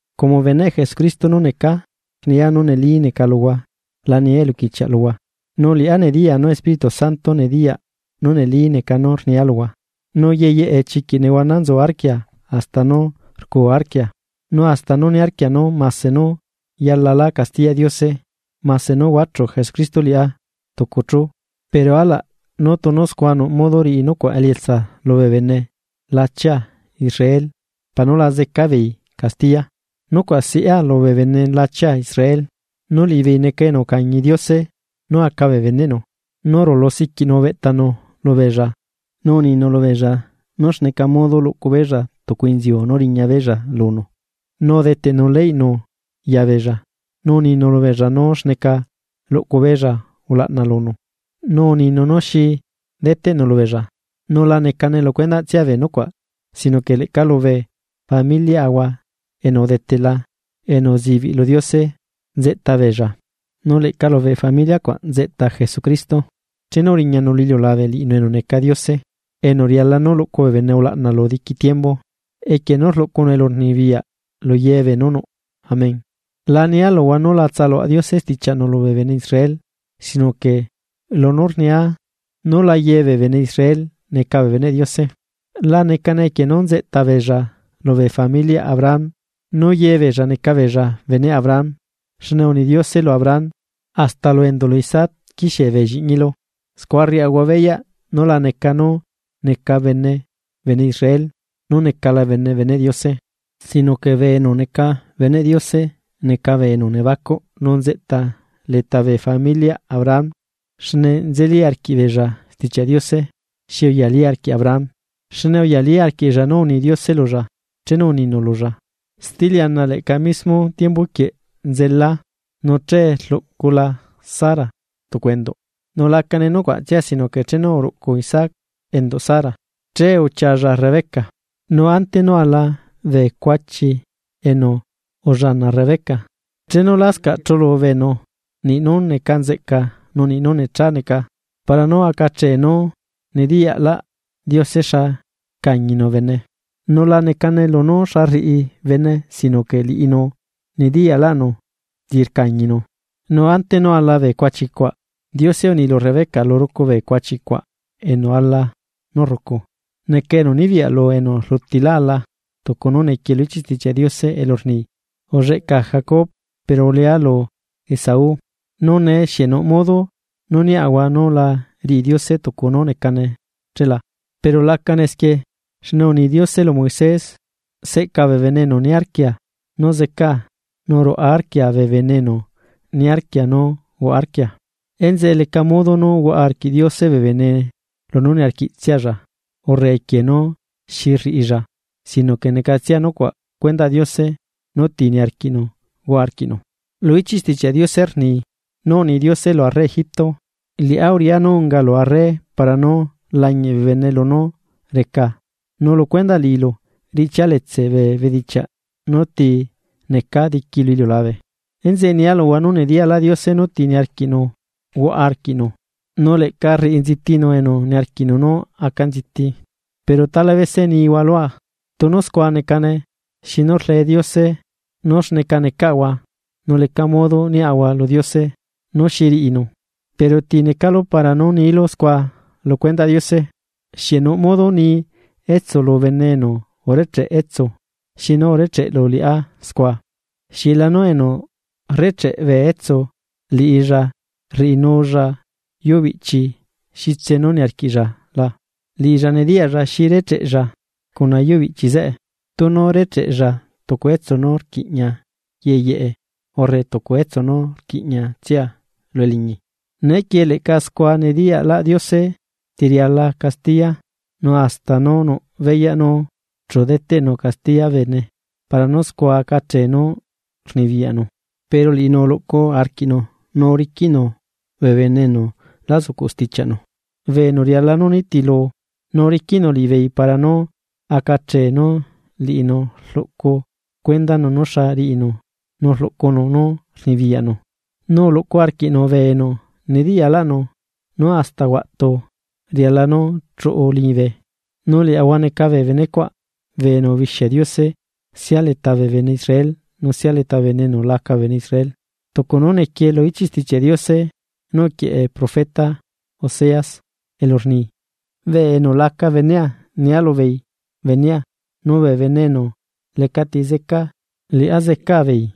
Como beneꞌ Jesucristo nú necaa, rnia nú neli neca luhua la nia eluquichiaꞌ luhua. Nu liꞌá nediyaa nú Espíritu Santo nediyaꞌ nú neli neca nú rniá luhua, nu yeyeꞌe chiquiꞌ nehuana nzu arquia hasta nú rcuu arquia. Nu hasta niarquia nú mase nú yalalá castiyaꞌ Diose mase nú huachu Jesucristo liꞌá tucu chu, pero alaꞌ nú tunu scua nuꞌ modo riꞌi nucuaꞌ elietsa lubee bene lachia Israel para nú la zeca beei castiya. Nucuaꞌ siꞌá lubee bene lachia Israel, nu liꞌibeei neca enu ucañi Diose nú aca bee beneꞌnu, nu rulu siquiꞌnu ubeꞌtanu lubeella, nu uninu lubeella nú xneca modo luꞌcubeella tucu inziu nú riña beella lunu, nu udeteꞌnu leynu yabeella, nu uninu lubeella nú xneca luꞌcubeella ulaꞌna lunu, nu uninu nú xi deteꞌnu lubeella. Nu la necane lucuendaꞌtsia bee nucuaꞌ, sino que leꞌca lubee familiaꞌahua enu udetela enu uzibiꞌ lu Diose nzeꞌtabeella, nu leꞌca lu familia cuaꞌ nzeꞌta Jesucristo chenu uriñanu lu iliulabe liꞌinu enu neca Diose enu riala nú luꞌcu bee bene ulaꞌna lu diqui tiembu, equie nú rluꞌcunu elurnibiyaꞌ lu yebee nú nuꞌ. Amén. La nia luhua nú la tsaluaꞌ Diose stichiaꞌnu lubee bene Israel, sino que lunú rnia nú la yebee bene Israel neca bee beneꞌ Diose. La necane equie nú nzeꞌtabeella lubee familiaꞌ Abraham nú yebeella neca beella beneꞌ Abraham, xne uni Diose lu Abraham: “Hasta lu enduꞌlu Isaac quixie bee lliꞌñilu.” Scua rriaꞌahua beyaꞌ nú la neca nú neca bene bene Israel, nú necala bene beneꞌ Diose, sino que bee enu neca beneꞌ Diose neca bee enu nebacuꞌ nzeꞌta leta bee familiaꞌ Abraham xne nzeli arquiꞌbeella Stichiaꞌ Diose xi uyalí arquiꞌ Abraham. Xne uyalí arquiꞌlla nú uni Diose lulla, chenu uninu lulla: “Steliana leꞌca mismo tiembuquieꞌ nzelaa nu che rluꞌcula Sara tucu enduꞌ.” Nu lacane nucuaꞌtsia sino que chenu uruꞌcu Isaac enduꞌ Sara, che uchialla Rebeca. Nu ante nú ala bee cuachi enu ullana Rebeca. Chenu lascaꞌ chulu beenu niꞌnú neca nzeꞌca nú niꞌ nú necha neca, para nú acachee nú nediyaꞌlaꞌ Diose xa rcañinu bene, nu la necane lunú xa rriꞌi bene sino que liꞌinu nediyaꞌlaꞌnu ti rcañinu, nu ante nú ala bee cuachi cuaꞌ, Diose uni lu Rebeca: “Lurucu bee cuachicuaꞌ enu ala nú rrucu, neca enu nibiyaꞌ lu enu rlutilá ala.” Tucu nú nequie lu ichiꞌ Stichiaꞌ Diose elu rni: “Ulleꞌcaa Jacob pero ulea lu Esaú.” Nu nee, ¿xieꞌ nuꞌ modo nú niaꞌahua nú la riꞌi Diose tucu nú necane ché la? ¡Pero lacane esquie! Xne uni Diose lu Moisés: “Seꞌcaa bee bene enu niarquia nú zeꞌcaa nu ruaꞌa arquia bee bene enu niarquia nú huaꞌa arquia.” Enzeꞌe leca modo nú huaꞌa arquiꞌ Diose bee bene lunú niarquiꞌtsialla urre equie nú xi rriꞌilla sino que necatsia nucuaꞌ cuendaꞌ Diose nú ti niarquiꞌnu huaꞌa arquiꞌnu. Lu ichiꞌ Stichiaꞌ Diose rni nú uni Diose lu arre Egipto: “Liꞌá uriꞌá nú ungalu arre para nú lañiꞌ bee bene lunú recaa nu lu cuendaꞌ liꞌilu riꞌchialetse bee bedichiaꞌ nú ti necaa diqui lu iliulabe.” Enzeꞌe nia luhua nú nediyaꞌlaꞌ Diose nú ti niarquiꞌnu huaꞌa arquiꞌnu, nu leꞌca rriꞌi nzitinu enu niarquiꞌnu nú aca nziti. Pero tala bese nihua lua: “Tunu scua necane, ¿xinu rle Diose nú xneca necaꞌahua nu leca modo niaꞌahua lu Diose nú xi riꞌinu?” Pero, ¿ti necalu para nú niilu scua lu cuendaꞌ Diose? Xieꞌ nuꞌ modo ni etsu lu bene enu urecheꞌ etsu: “¿Xinu urecheꞌlu liꞌá scua?” ¿Xieꞌlanu enu rrecheꞌ bee etsu, liꞌilla rriꞌinulla yuubiꞌchi xitse nú niarquiꞌlla la? Liꞌilla nediyaꞌlla xi recheꞌlla cuna yuubiꞌchi zeꞌe, tunu recheꞌlla tucu etsu nú rquiꞌña yeyeꞌe urre tucu etsu nú rquiꞌñiatsia lu eliñi. Neequie leꞌca scua nediyaꞌlaꞌ Diose ti riala castiya, nu hasta nú nuꞌ beyaꞌ nú chu deteꞌnu castiya bee bene para nú scua acachee nú rluꞌcunu poder pero liꞌinu uluꞌcu arquiꞌnu nu uriquiꞌnu bee bene enu lá zucuꞌ stichiaꞌnu bee enu riala nú nitilu. Nu uriquiꞌnu liꞌibeei para nú acachee nú liꞌinu rluꞌcu cuendanu nú xa riꞌinu nu rluꞌcunu nú rnibiyaꞌnu, nu uhuaꞌa arquiꞌnu bee enu nediyaꞌlaꞌnu nú hasta huaꞌtu riala nú chuꞌu liñibe. Nu liaꞌahua neca bee benecuaꞌ, bee enu ubixia Diose sia leta bee bene Israel nu sia leta bee bene enu laca bee bene Israel. Tucu nú nequie lu ichiꞌ Stichiaꞌ Diose nú uquieꞌe profeta Oseas, elu rni: Bee enu laca benea, nia lubeei benea, nu bee bene enu lecati zeca, liꞌá zecaa beei.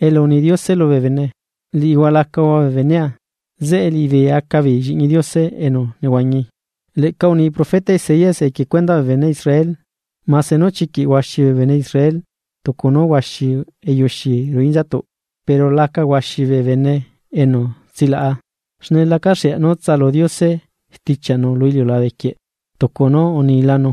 Elu uni Diose lubee bene: “Liꞌihua lacahua bee benea”, zeꞌe liꞌibeei acabeei lliꞌñi Diose enu nehuañi. Leꞌca uni profeta Isaías equie cuendaꞌ bee bene Israel: “Mase nú chiquiꞌ huaxi bee bene Israel tucu nú huaxi eyuxi ruꞌu inzatuꞌ, pero laca huaxi bee bene enu tsilaꞌa. Xne lacaxea nú tsalu Diose stichiaꞌnu lu iliulabequieꞌ tucu nú unilanu.”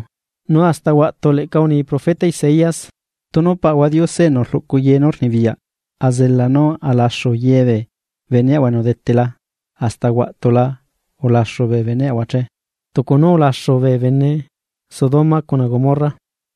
Nu hasta huaꞌtu leꞌca uni profeta Isaías: Tunu Paꞌahua Diose enu rluꞌcu ye nú rnibiyaꞌ azela nú alaxu yebee beneꞌahua enu udetela, hasta huaꞌtula ulaxu bee beneꞌahua che, tucu nú ulaxu bee bene Sodoma cuna Gomorra.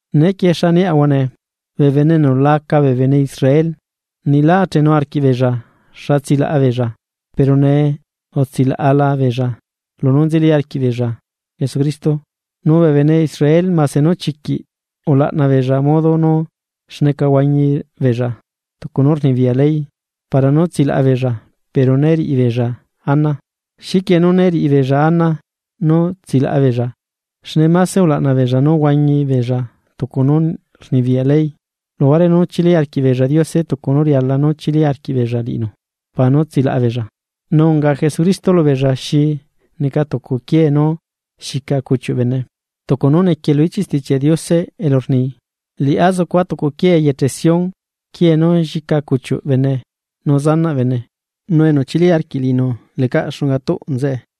Neequie, ¿xaniaꞌahua nee? Bee bene enu laca bee bene Israel niꞌ lá achenu arquiꞌbeella xa tsilaꞌa beella pero nee utsilaꞌala beella lunú nzeli arquiꞌbeella Jesucristo. Nu bee bene Israel mase nú chiquiꞌ ulaꞌna beella modo nú xneca huañibeella tucu nú rnibiyaꞌ ley para nú tsilaꞌa beella pero né riꞌibeella ana. ¿Xiquie nú né riꞌibeella ana nú tsilaꞌa beella? Xne mase ulaꞌna beella nú huañi beella tucu nú rnibiyaꞌ ley, luhuare nú chili arquiꞌbeella Diose tucu nú riala nú chili arquiꞌbeella liꞌinu para nú tsilaꞌa beella. Nu unga Jesucristo lubeella: “Xi neca tucu quiee nú xica cuchiuꞌ bene.” Tucu nú nequie lu ichiꞌ Stichiaꞌ Diose elu rni: Liꞌá zucua tucu quiee eyeche Sión, quiee nú llica cuchiuꞌ bene, nu zanaꞌ bene. Nu enu chili arquiꞌ liꞌinu lecaꞌ xunga tuꞌ nzeꞌe.